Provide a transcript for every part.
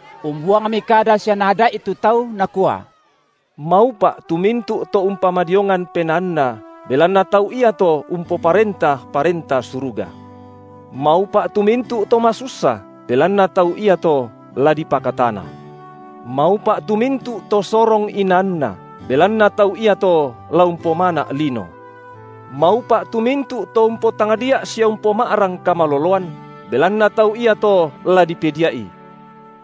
Umbuangmi kada sia Naada’i tu tau, Nakua: Maupa’ tu mintu’ to umpamadiongan penaanna belanna tau iato umpoparenta Parenta Suruga. Maupa’ tu mintu’ to masussa, belanna tau iato la dipakatana. Maupa’ tu mintu’ to sorong inaanna, belanna tau iato la umpomana’ lino. Maupa’ tu mintu’ to umpotangdia’ sia umpoma’rang kamaloloan, belanna tau iato la dipedia’i.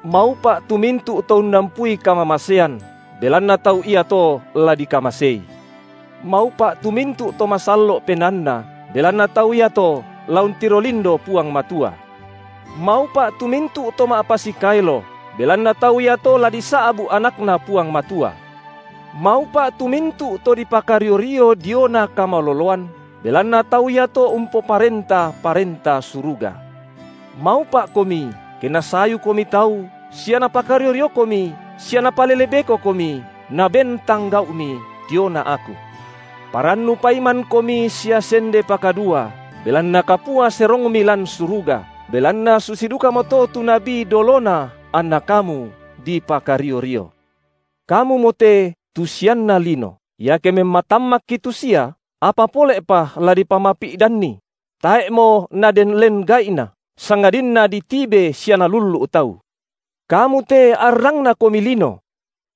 Maupa’ tu mintu’ to unnampui kamamasean, belanna tau iato la dikamasei. Maupa’ tu mintu’ to masallo’ penaanna, belanna tau iato la untiro lindo Puang Matua. Maupa’ tu mintu’ to ma’pasikaelo, belanna tau iato la disa’bu’ AnakNa Puang Matua. Maupa’ tu mintu’ to dipakario-rio diona kamaloloan, belanna tau iato umpoparenta Parenta Suruga. Maupa’komi ke nasayukomi tau sia napakario-riokomi sia napalele bekokomi naben tang gau’mi diona Aku. Parannu paimankomi sia sende pakadua, belanna kapua serongmi lan suruga, belanna susi dukamoto tu nabi dolona anna kamu, dipakario-rio. Kamumo te tu sianna lino. Iake memmatammakki tu sia, apa pole’pa la dipamapi’danni? Tae’mo naden len gai’na, sangadinna ditibe sia nalullu’ tau. Kamu te arrangnakomi lino.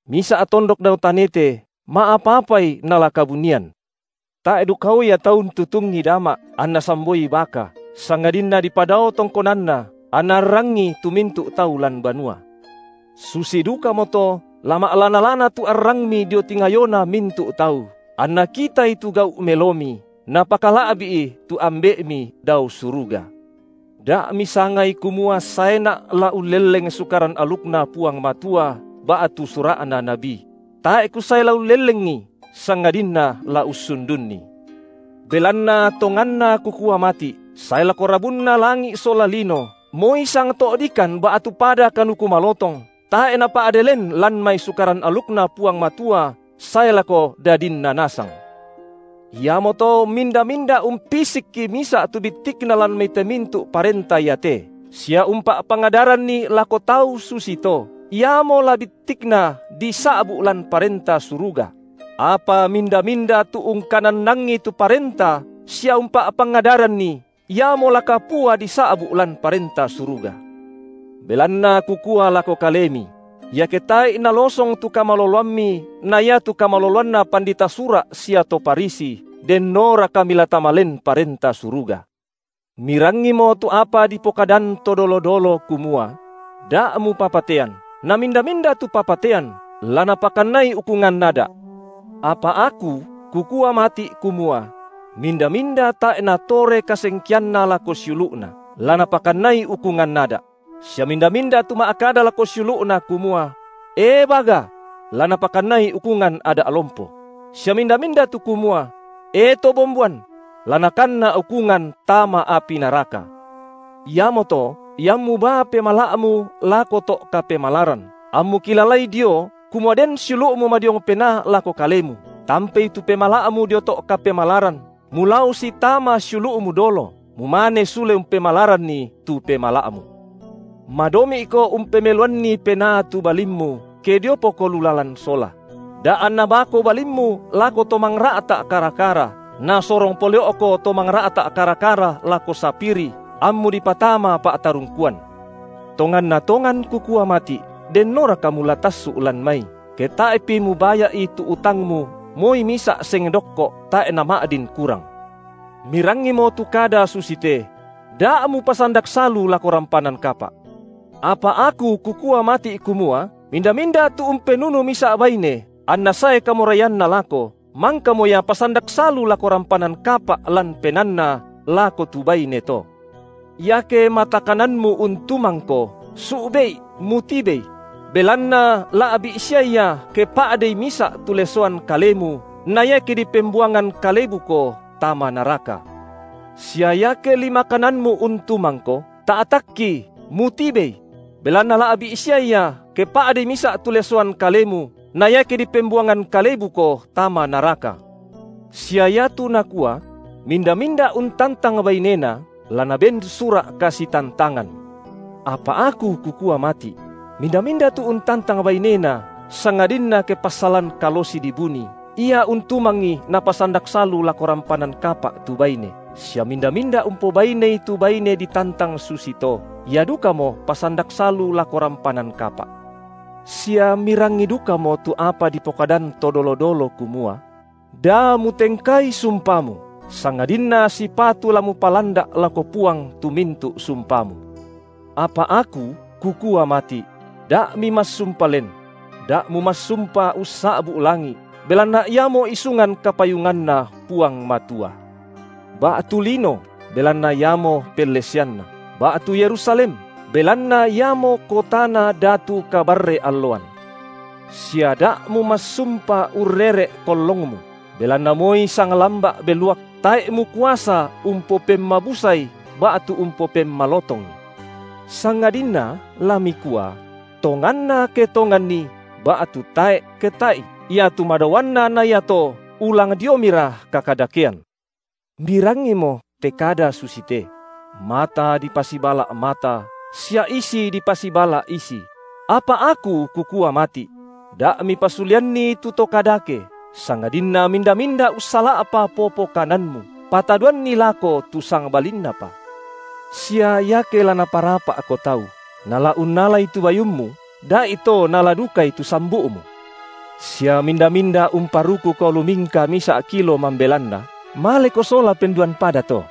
Misa’ tondok dao tanete, ma’apa-apai nala kabunian. Tae’ dukao ia tau untutungi dama’, anna samboi baka, sangadinna dipadao tongkonanna, anna arrangi tu mintu’ tau lan banua. Susi dukamoto la ma’lana-lana tu arangmi dio tingayona mintu’ tau, anna kitai tu gau’ melomi, napakala’bi’i tu Ambe’mi dao suruga. Da’ misangai kumua saeNa’ la ullelleng Sukaran alukNa Puang Matua ba’tu sura’na nabi; tae’ Kusae la ullellengi sangadinna la ussundunni. Belanna tonganna Kukua mati’, sae lako rabunna langi’ sola lino, moi sangto’dikan ba’tu pada kanuku malotong tae’ napa’de len lan mai Sukaran alukNa Puang Matua sae lako dadinna nasang. Iamoto minda-minda umpisikki misa’ tu bittikna lan mai te mintu’ parenta iate, sia umpa’pangadaranni lako tau susi to, iamo la bittikna disa’bu’ lan Parenta Suruga; apa minda-minda tu ungkanannangi tu parenta sia umpa’pangadaranni, iamo la kapua disa’bu’ lan Parenta Suruga. Belanna Kukua lako Kalemi: Iake tae’i nalosong tu kamaloloammi na iatu kamaloloanna pandita Sura’ sia to Farisi, dennoraka mila tama len Parenta Suruga. Mirangimo tu apa dipokadan to dolo-dolo kumua: Da’ mupapatean, na minda-minda tu papataen, la napakannai ukungan ada’. Apa Aku Kukua mati’ kumua: minda-minda tae’ natore kasengkeanna lako siulu’na, la napakannai ukungan ada’; sia minda-minda tu ma’kada lako siulu’na kumua: E baga! La napakannai ukungan ada’ lompo; sia minda-minda tu kumua: E to bomboan? La nakanna ukungan tama api naraka. Iamoto, iammu baa pemala’mu lako to’ kapemalaran, ammu kilalai dio, kumua den siulu’mu madiong penaa lako kalemu, tampei tu pemala’mu dio to’ kapemalaran, mulao sitama siulu’mu dolo, mumane sule umpemalaranni tu pemala’mu. Madomi’ko umpemeloanni penaa tu balimmu, ke diopoko lu lalan sola; da’ anna baako balimmu lako to mangra’ta’ kara-kara, nasorong pole’oko to mangra’ta’ kara-kara lako sapiri, ammu dipatama pa’tarungkuan. Tonganna tongan Kukua mati’; dennoraka mula tassu’ lan mai, ke tae’pi mubaya’i tu utangmu moi misa’ seng dokko’ tae’ nama’din kurang. Mirangimo tu kada susite: Da’ mupasandak salu lako rampanan kapa’. Apa Aku Kukua mati’ kumua, minda-minda tu umpenunu misa’ baine anna sae kamoraianna lako, mangkamo ia pasandak salu lako rampanan kapa’ lan penaanna lako tu baine to. Iake mata kananmu untumangko, su’be’i, mutibei; belanna la’bi’ sia ia ke pa’dei misa’ tu lesoan kalemu na iake dipembuangan kalebuko tama naraka. Sia iake lima kananmu untumangko, ta’takki, mutibei; belanna la’bi’ sia ia ke pa’dei misa’ tu lesoan kalemu, na iake dipembuangan kalebuko tama naraka. Sia iatu nakua: Minda-minda untantang bainena, la naben sura’ kasitantangan. Apa Aku Kukua mati’: Minda-minda tu untantang bainena sangadinna ke passalan kalosi dibuni, ia untumangi napasandak salu lako rampanan kapa’ tu baine, sia minda-minda umpobainei tu baine ditantang susi to, ia dukamo pasandak salu lako rampanan kapa’. Sia mirangi dukamo tu apa dipokadan to dolo-dolo kumua: Da mutengkai sumpamu, sangadinna sipatu la mupalanda’ lako Puang tu mintu’ sumpamu. Apa Aku Kukua mati’: Da’ mimassumpa len; da’ mumassumpa ussa’bu’ langi’, belanna iamo isungan kapayunganNa Puang Matua; ba’tu lino, belanna iamo pelleseanNa, ba’tu Yerusalem, belanna iamo kotana Datu kabarre-alloan; sia da’ mumassumpa urrere’ kollongmu, belanna moi sang lamba’ beluak tae’ mukuasa umpopemmabusai ba’tu umpopemmalotongi. Sangadinna la mikua: tonganna ke tonganni, ba’tu tae’ ke tae’i, iatu madaoanna na iato ulang diomira kakadakean. Mirangimo te kada susite: Mata dipasibala’ mata, sia isi dipasibala’ isi; apa Aku Kukua mati’: Da’ mipasuleanni tu to kadake, sangadinna minda-minda ussala’pa popo kananmu, patadoanni lako tu sangbalinnapa. Sia iake la naparapa’ko tau, nala unnalai tu bayummu, da’ito naala dukai tu sambu’mu. Sia minda-minda umparukuko lumingka misa’ kilo mambelanna, maleko sola penduan pada to.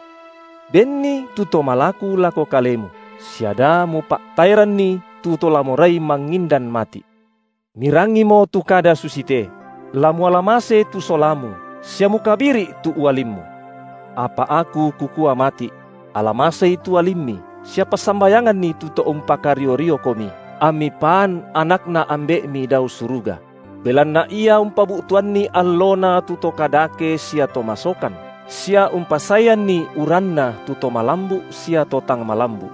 Benni tu to malaku lako kalemu, sia da mupa’taeranni tu to la morai mangindan mati’. Mirangimo tu kada susite: la muala mase tu solamu, sia mukabiri’ tu ualimmu. Apa Aku Kukua mati’: Ala masei tu ualimmi, sia passambayanganni tu to umpakario-riokomi, ammi paan anakNa Ambe’mi dao suruga; belanna Ia umpabu’tuanni alloNa tu to kadake sia to masokan, sia umpasaeanni uranNa tu to malambu’ sia to tang malambu’.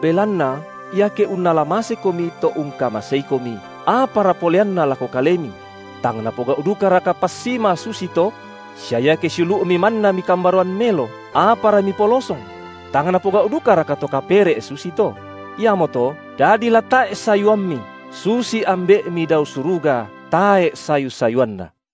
Belanna iake unnala masekomi to ungkamaseikomi, apara poleanna lako kalemi? Tang napogau’ dukaraka passima susi to? Sia iake siulu’mi manna mikambaroan melo, apara mipolosong? Tang napogau’ dukaraka to kapere’ susito? Iamoto dadi la tae’ sayuammi, susi Ambe’mi dao suruga tae’ sayu-sayuanNa.